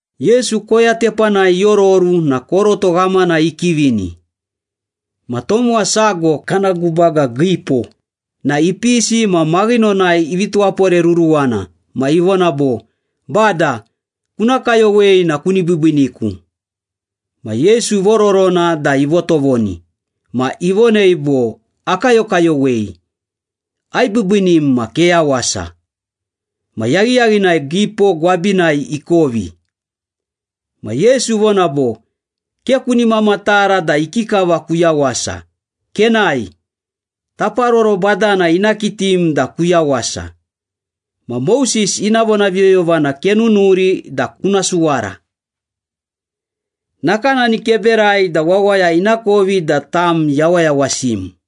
Yesu koya tepanai iororu na koroto ghamana ikivini. Ma tomowa sago, kana gubaga giipo na ipisi ma maghinonai ivi tuwaporeruruwana ma ivona bo, “Bada, kuna kayowei na kuni biibiiniku.” Ma Yesu ivororona da ivotovoni. Ma ivonei bo, “Akayokayowei. Aibiibiinim ma keyawasa.” Ma yaghiyaghinai giipo gwabinai ikovi. Ma Yesu ivona bo, “Ke kuni mamatara da ikikava kuyawasa. Kenae, taparoro badana ina kitim da kuyawasa. Ma Moses ina vonaviyoyovana kenunuri da kuna suwara. Nakanani keberai da wawaya inakovi da tam yawayawasim.”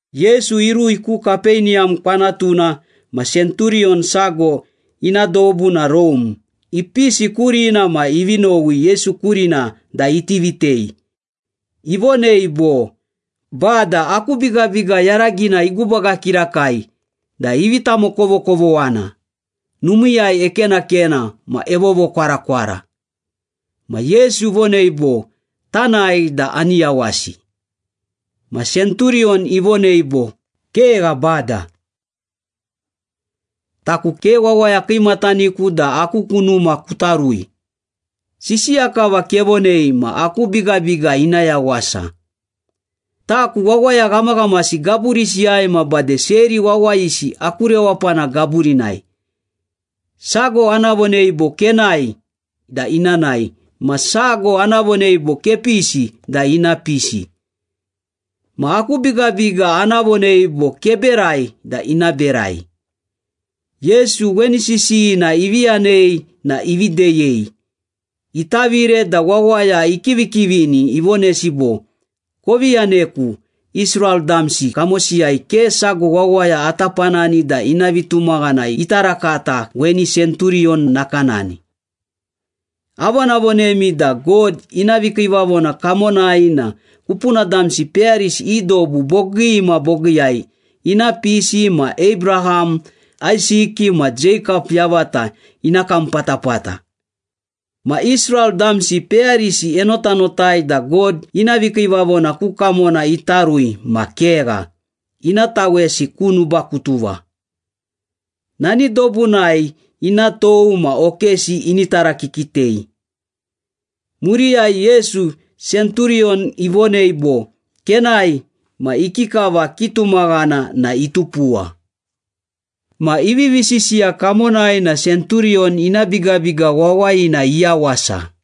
Yesu irui ku Kapeniyam kwanatuna ma senturiyon sago ina dobu na Rome, ipisi kurina ma ivi nowi Yesu kurina da iti vitei. Ivonei bo, “Bada, aku bigabiga yaragina igubaga kirakai da ivi tamokovokovoghana, numiiyai ekenakena ma evovokwarakwara.” Ma Yesu ivonei bo, “Tanae da ani yawasi.” Ma senturiyon ivonei bo, “Kegha, Bada. Taku ke wawaya kiimataniku da aku ku numa kuta rui. Sisiya kava kevonei ma aku bigabiga ina yawasa. Taku wawaya ghamaghamasi gaburisiyai ma bade seri wawayisi aku rewapana gaburinai. Sago ana vonei bo, ‘Kenae’ da ina nae. Ma sago ana vonei bo, ‘Kepisi’ da ina pisi. Ma aku bigabiga ana vonei bo, ‘Keberai’ da ina berai.” Yesu weni sisiyina ivi yanei na ivi deyei. Itavire da wawaya ikivikivini ivonesi bo, “Kovi yaneku. Israel damsi kamosiyai ke sago wawaya ata panani da ina vitumaghana ita rakata weni senturiyon nakanani. Avonavonemi da God ina vikiivavona kamonai na kupuna damsi peyarisi i dobu bogii ma bogiiyai ina pisi ma Abraham, Aisiki ma Jeikap yavata ina kam patapata. Ma Israel damsi peyarisi enotanotai da God ina vikiivavona ku kamona ita rui ma kegha, ina tawesi ku nubakutuva. Nani dobunai ina tou ma okesi ini tarakikitei.” Muriyai Yesu, senturiyon ivonei bo, “Kenae ma ikikava kitumaghana na itupuwa.” Ma ivivi sisiya kamonai na senturiyon ina bigabiga wawayina iyawasa.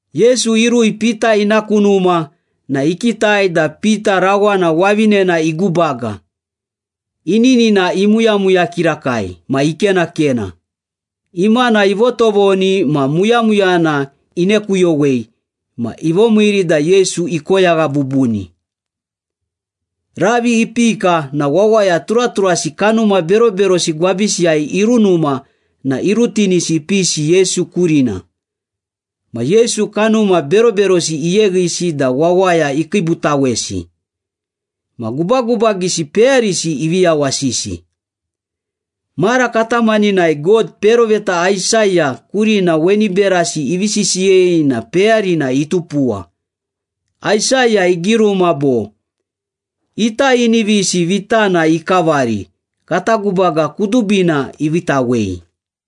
Yesu irui Pita ina ku numa na ikitai da Pita rawana wavinena igubaga, ininina imuyamuya kirakai ma ikenakena. Imana ivotovoni ma muyamuyana inekuyowei ma ivomiiri da Yesu ikoyagha bubuni. Ravi ipika na wawaya turaturasi kanuma beroberosi gwabisiyai irunuma na irutinisi ipisi Yesu kurina. Ma Yesu kanuma beroberosi iyeghisi da wawaya ikiibutawesi. Ma gubagubagisi peyarisi ivi yawasisi. Mara katamaninai God peroveta Aisaya kurina weni berasi ivi sisiyei na peyarina itupuwa. Aisaya igiruma bo, “Ita inivisi vitana ikavari, Kata gubaga kudubina iviitawei.”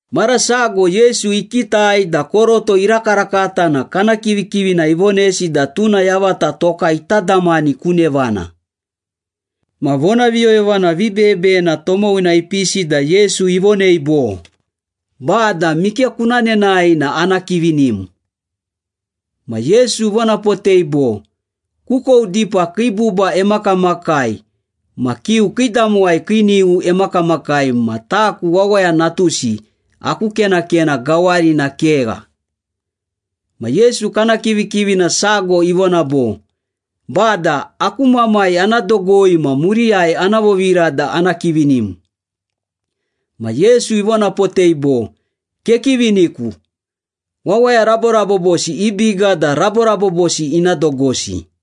Mara sago Yesu ikitai da koroto irakarakata na kana kivikivina ivonesi da tuna yavata toka ita damani ku nevana. Ma vonaviyoyovana vibeyebeyena tomowina ipisi da Yesu ivonei bo, “Bada, mike kuna nenae na ana kivinim.” Ma Yesu ivonapotei bo, “Kukou dipa kii buba emakamakai ma kiu kiidamowai kii nighu emakamakai ma taku Wawaya Natusi, aku kenakena gawarina kegha.” Ma Yesu kana kivikivina sago ivona bo, “Bada, aku mamai ana dogoi ma muriyai ana vovira da ana kivinim.” Ma Yesu ivonapotei bo, “Kekiviniku. Wawaya raborabobosi i biga da raborabobosi ina dogosi.”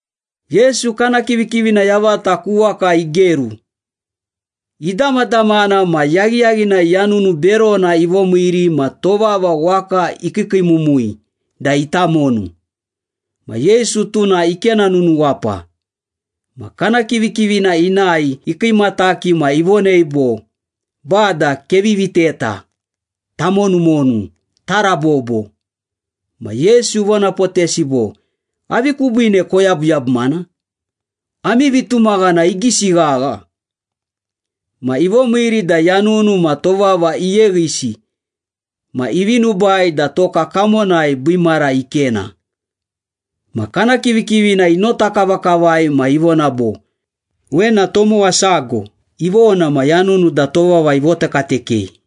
Yesu kana kivikivina yavata ku waka igeru. Idamadamana ma yaghiyaghinai yanunu berona ivomiiri ma tovava waka ikiikiimumui da ita monu. Ma Yesu, tuna ikena nunuwapa. Ma kana kivikivina inae ikiimataki ma ivonei bo, “Bada, kevi viteta! Tamonumonu, tarabobo!” Ma Yesu ivonapotesi bo, “Avi kubiine koyabuyabumana? Ami vitumaghana igisi ghagha!” Ma ivomiiri da yanunu ma tovava iyeghisi ma ivi nubai da toka kamonai biimara ikena. Ma kana kivikivina inota kavakavai ma ivona bo, “Wena tomowa sago! Ivona, ma yanunu da tovava ivotekatekei!”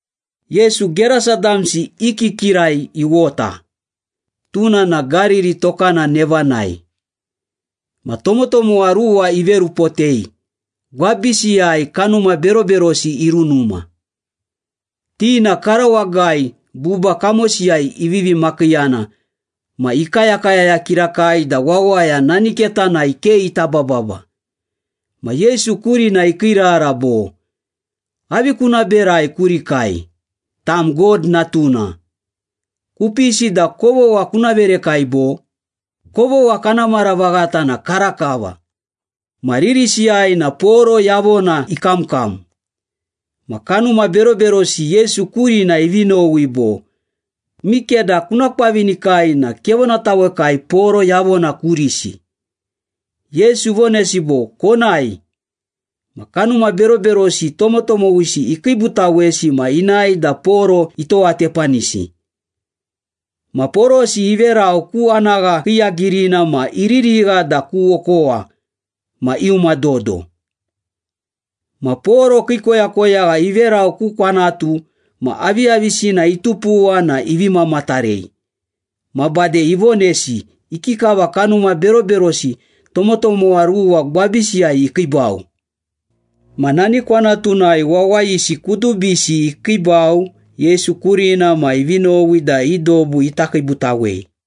Yesu Gerasa damsi i kikirai iwota, tuna na Gariri tokana nevanai. Ma tomotomowa ruwa iverupotei, gwabisiyai kanuma beroberosi irunuma. Ti na karawagai, buba kamosiyai ivivi makiiyana ma ikayakayaya kirakai da wawaya nani ketanai ke ita bababa. Ma Yesu kurina ikiirara bo, “Avi kuna berai kurikai? Tam God Natuna. Kupisi da kovogha kuna verekai, bo? Kovogha kana mara vaghata na karakava.” Ma ririsiyai na poro yavona ikamkam. Ma kanuma beroberosi Yesu kurina ivi nowi bo, “Mikeda kuna kwavinikai na kevonatawekai poro yavona kurisi.” Yesu ivonesi bo, “Konae.” Ma kanuma beroberosi tomotomowisi ikiibutawesi ma inae da poro itowatepanisi. Ma porosi iverau ku anagha kiiyagirina ma iririgha da ku okowa ma iuma dodo. Ma poro kii koyakoyagha iverau ku kwanatu ma aviyavisina itupuwa na ivi mamatarei. Ma bade ivonesi ikikava kanuma beroberosi tomotomowa ruwa gwabisiyai ikiibau. Ma nani kwanatunai wawayisi kudubisi ikiibau Yesu kurina ma ivi nowi da i dobu ita kiibutawei.